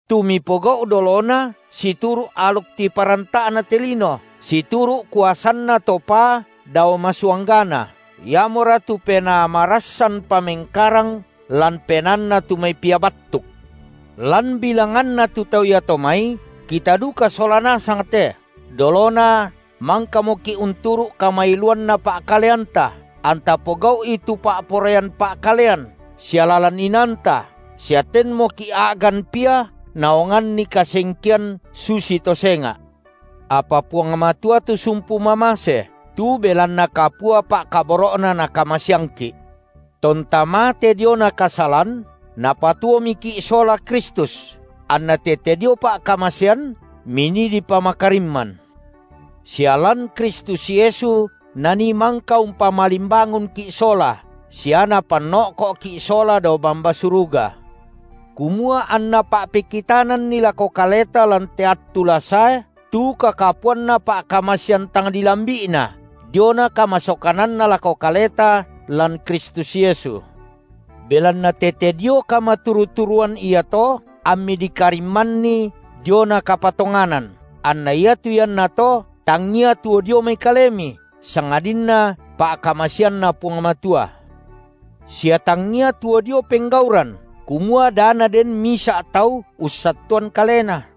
tu mipogau’ dolona situru’ aluk tiparanta’na te lino, situru’ kuasanna to paa dao masuanggana, iamora tu penaa marassanpa mengkarang lan penaanna tu mai pia battuk. Lan bilanganna tu tau iato mai, kita duka sola nasang te, dolona mangkamoki’ unturu’ kamailuanna pa’kaleanta, anta pogau’i tu pa’poraian pa’kalean sia lalan inaanta sia tenmoki’ a’gan pia naonganni kasengkean susito senga’. Apa Puang Matua tu sumpu mamase, tu belanna kapua pa’kaboro’Na Nakamaseangki’, tonta mate diona kasalan, Napatuomiki’ sola Kristus – anna tete dio pa’kamasean, minii dipamakarimman –, sia lan Kristus Yesu Nanii mangka umpamalimbangunki’ sola sia Napanno’ko’ki’ sola dao bamba suruga, kumua anNa pa’pekitananni lako kaleta lan te attu la sae tu kakapuanna pa’kamasean tang dilambi’Na diona kamasokananNa lako kaleta lan Kristus Yesu. Belanna tete dio kamaturu-turuan iato ammi dikarimmanni diona kapatonganan, anna iatu iannato tangia tuo dio mai kalemi, sangadinna pa’kamaseanNa Puang Matua, sia tangia tuo dio penggauran, kumua da naden misa’ tau ussattuan kalena.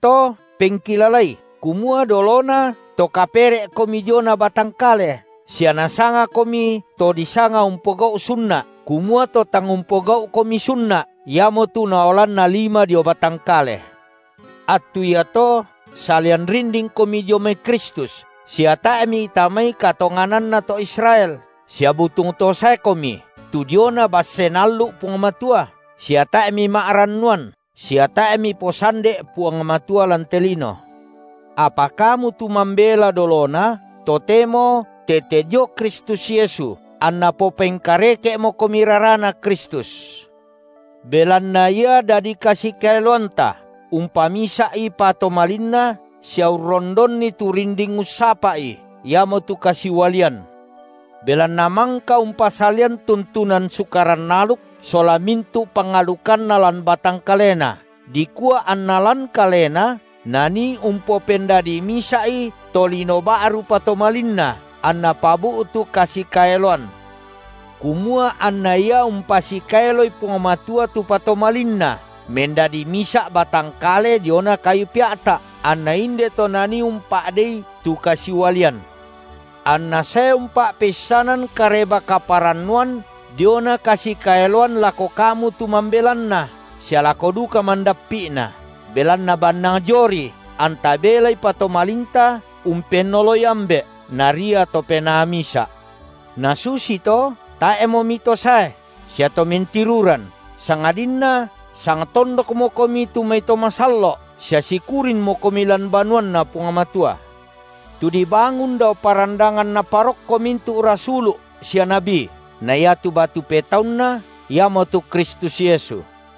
Iamoto pengkilalai, kumua dolona to kapere’komi diona batang kale sia nasangakomi to disanga umpogau’ sunna’, kumua to tang umpogau’komi sunna’, iamotu naolanna lima dio batang kale. Attu iato salian rindingkomi dio mai Kristus sia tae’ mitamai katongananna to Israel sia butung to saekomi tu diona basse Naallu’ Puang Matua sia tae’ mima’rannuan sia tae’ miposande’ Puang Matua lan te lino. Apa kamu tu mambela dolona, totemo tete dio Kristus Yesu, anna popengkareke’mokomi raraNa Kristus. Belanna Ia dadi kasikaeloanta, umpamisa’i patomalinna sia urrondonni tu rinding ussapa’i, iamotu kasiualian; belanna mangka umpasalian tuntunan sukaran aluk sola mintu’ pangalukanna lan batang kaleNa, dikua anna lan Kalena Nanii umpopendadi misa’i tolino ba’ru patomalinna anNa pabu’tu kasikaeloan, kumua anna Ia umpasikaeloi Puang Matua tu patomalinna mendadi misa’ batang kale diona kayu pea’ta’, anna inde to Nanii umpa’dei tu kasiualian. AnNa sae umpa’peissanan Kareba-kaparannuan diona kasikaeloan lako kamu tu mambelanna sia lako duka mandappi’na, belanna bannang dioRi anta belai patomalinta umpennoloi Ambe’, Naria to Penaa misa’. Nasusito tae’mo mitosae sia to mentiruran, sangadinna sangtondokmokomi tu mai to masallo’ sia sikurinmokomi lan banuanNa Puang Matua, tu dibangun dao parandangan naparokko mintu’ rasulu’ sia nabi, na iatu batu petaunna iamotu Kristus Yesu.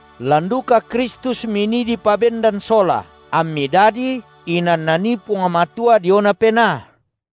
Lan duka Kristus minii dipabendan sola, ammi dadi inan Nanii Puang Matua diona Penaa.